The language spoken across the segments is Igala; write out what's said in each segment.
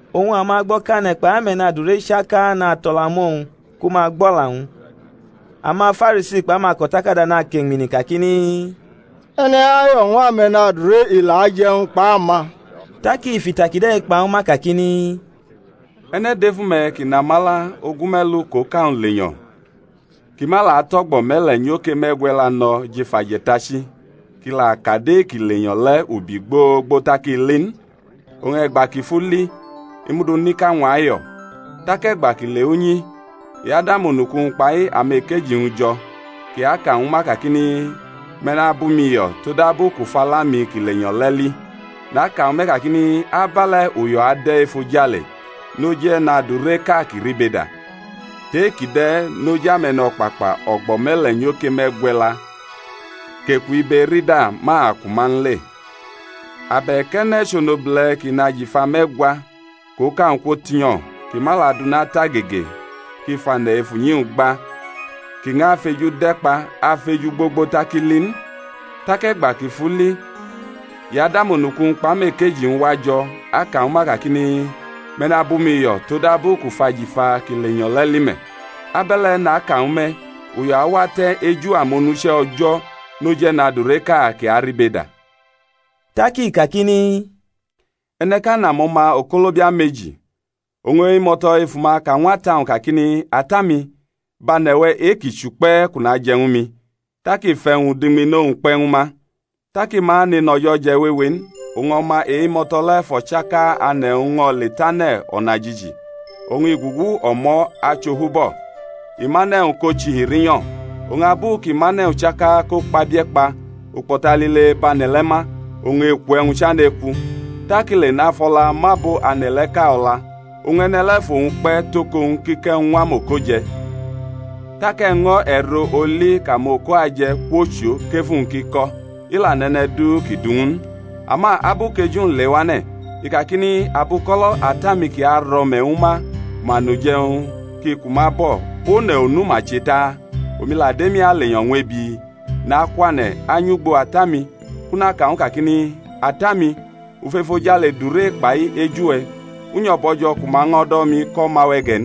Oñ amagbo̩kane̩ kpai ame̩nadure chaka nato̩la mʼowñ ku ma gbʼo̩la-wñ. AmaFarisi kpʼamako̩takada nakeñmini kakini, E̩ne̩-i ayo̩ ñw ame̩nadure, i la ajʼe̩wñ kpʼama. Tak i fʼita kide̩ kpa ñwu ma kakini, E̩ne̩ dʼefu-me̩ kʼi nʼamala ogume̩lu kʼoka-wñ lenyo̩, kʼi ma la tʼo̩gbo̩ me̩le̩ nyoke me̩gwe̩la no̩ jʼef aje̩tachi, kʼi la kadʼe-kʼi lenyo̩ le̩ ubi gbogbo tak i li n? Oñ e̩gba kʼi fʼu li, i mʼu du nʼika-wñ ayo̩. Tak e̩gba kʼi lewʼunyi, i adʼamonuku-wñ kpai amekeji-wñ jo̩, kʼi aka ñwu ma kakini, Me̩ nabʼumi yo̩ todabu kʼu fʼala-mi kʼi lenyo̩ le̩ li. Naka ñwu me̩ kakini, Abe̩le̩ uyo̩ ade̩ efojale noj e̩nadureʼka kʼi ribeda, tʼe-kʼi de̩ noj ame̩no̩kpakpa o̩gbo̩ me̩le̩ nyoke me̩gwe̩la kʼeku ibe-erida ma ku ma n le. Abe̩k e̩ne̩ chʼonobule̩ kʼi nʼajifa me̩gwa, kʼoka-wñ kwotinyo̩, kʼi ma la dʼuna tʼagege, kʼi fʼane̩ ef unyi gba kʼi ñʼafʼeju de̩kpa afeju gbogbo tak i li n? Tak e̩gba kʼi fʼu li i adʼamonuku-wñ kpʼamekeji-wñ wajo̩ aka ñwu ma kakini, Me̩ nabʼumi yo̩ todabu kʼu fʼajifa ki lenyo̩ le̩ li me̩. Abe̩le̩, naka ñwu me̩, uyo̩ awate̩ eju amonuche̩ O̩jo̩ noj e̩nadureʼka kʼi aribeda. Tak i kakini, E̩ne̩ʼka nʼamo̩ma okolobia meji. Oñ e-imo̩to̩ efu ma ka ñw ata-wñ kakini, Ata-mi, bʼane̩-we̩ e-ki chʼukpe̩ kʼu naje̩ ñwu mi. Tak i fʼe̩wñ-udiñmino-wñ kpe̩ ñwu ma. Tak i ma nenʼo̩jo̩ wewe n, oñ o̩ma e-imo̩to̩ le̩ fʼo̩chaka ane̩-wñ ño̩ le tʼane̩ o̩najiji, oñ i gugu o̩mo̩ achʼofubo̩, i mʼane̩-wñ ko chihi rinyo̩. Oñ abu kʼi mʼane̩-wñ chaka ko kpabie̩ kpa ukpo̩ta lile bʼane̩ le̩ ma; oñ eku-e̩wñ chane̩ ekʼu. Tak i le nafʼo̩la mʼabo ane̩ le̩ʼka o̩la, oñ e̩ne̩ le̩ fʼowñ kpe̩ tʼoko-wñ kʼi kʼe̩wñ ñw amoko je̩. Tak e̩ño̩ e̩ro-oli kʼamoko aje̩ kwochʼo kʼefu-wñ ki ko̩; i la nʼe̩ne̩ du ki du ñw u n. Ama abu kʼeju-wñ lewane̩ i kakini, Abuko̩lo̩ ata-mi kʼi aro̩me̩ ñwu ma ku ma nʼuje̩wñ ki ku ma bo̩, one̩ onu ma che ta? Omi la dʼemi alenyo̩ ñw ebi! Nakwane̩ anyʼugbo ata-mi kʼu naka ñw u kakini, Ata-mi, u fʼefojale dure kpai eju-we̩; u nyo̩ bo̩jo̩ ku ma ño̩ do̩ mi kʼo̩ma-we̩ ge̩ n.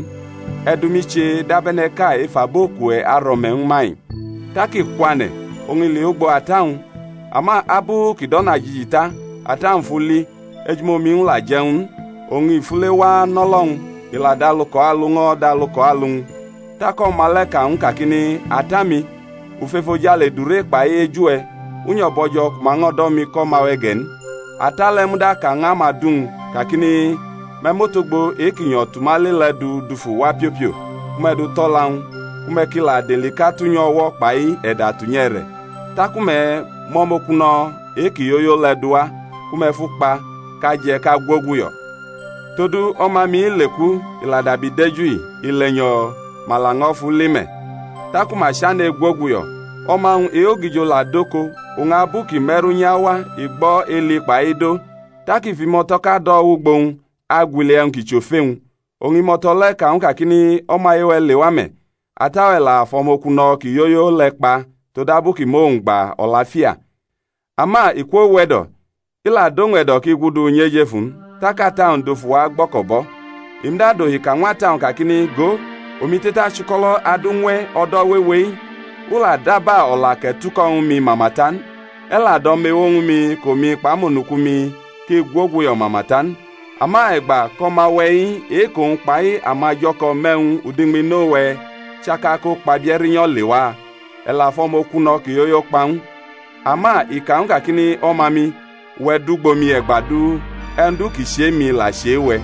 E̩ du mi che dab e̩ne̩ʼka ef abo kʼuwe̩ aro̩me̩ ñwu ma-i. Tak i kwane̩, oñ i lewʼugbo ata-wñ. Ama abu kʼi dʼo̩najiji ta, ata-wñ fʼu li, ejumomi-wñ la je̩ ñw u n, oñ i fule wa anʼo̩lo̩-wñ, i la dʼalu kʼo̩ alu ño̩ dʼalu kʼo̩ alu-wñ. Tak o̩ma le̩ ka ñw u kakini, Ata-mi, u fʼefojale dure kpai eju-we̩, u nyo̩ bo̩jo̩ ku ma ño̩ do̩ mi kʼo̩ma-we̩ ge̩ n. Ata le̩ muda ka ñw amadu-wñ kakini, Me̩ mʼotogbo e-ki nyo̩ tʼuma le le̩ du dufu wa piopio ku me̩ du tʼo̩la-wñ ku me̩ ki la dʼelika tʼunyʼu o̩wo̩ kpai e̩da tunyʼu e̩re̩. Taku me̩ mʼo̩mokuno̩ e-ki yoyo le̩ duwa ku me̩ fʼu kpa, kʼa je̩ kʼa gwoguyo̩, todu o̩ma-mi-i leku, i la dabi deju-i; i lenyo̩, ma laño̩ fʼu li me̩. Taku ma chane̩ egwoguyo̩. O̩ma-wñ e-ogijo la dʼoko, oñ abu kʼi me̩ru unyi awa, i gbo̩ eli kpai ido. Tak i fʼimo̩to̩ʼka do̩ wʼugbo-wñ agwili e̩wñ ki chʼofe-wñ. Oñ imo̩to̩ le̩ ka ñw u kakini, O̩maye-we̩ lewa me̩; ata-we̩ la fʼo̩mokuno̩ ki yoyo le̩ kpa todabu kʼi mʼowñ gba o̩lafia. Ama i kwowe̩do̩, i la dʼowñ e̩do̩ kʼi gudu nyʼejefu n: tak ata-wñ dufu wa agbo̩ko̩bʼo̩. I muda dohi ka ñw ata-wñ kakini, Go, omi te̩tachʼuko̩lo̩ adu ñw e̩ o̩do̩ wewe-i, u la daba o̩la kʼe̩ tuko̩ ñwu mi mama ta n; e̩ la dʼo̩mewo ñwu mi kʼomi kpʼamonuku-mi ki gwoguyo̩ mama ta n; ama e̩gba kʼo̩ma-we̩-i e-kʼowñ kpai amajo̩ko̩ mʼe̩wñ udiñmino-we̩ chaka ko kpabie̩ rinyo̩ lewa, e̩ la fʼo̩mokuno̩ ki yoyo kpa ñw u. Ama i ka ñw u kakini, O̩ma-mi, uwe̩ dʼugbo mi e̩gba du; e̩wñ du ki chʼe-mi la chʼe-we̩.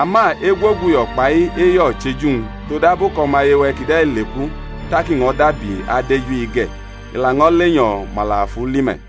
Ama egwoguyo̩ kpai eyo̩ chʼeju-wñ; todabu kʼo̩maye-we̩ kide̩ leku, tak i ño̩ dabi adeju-i ge̩; i laño̩ lenyo̩, ma la fʼu li me̩.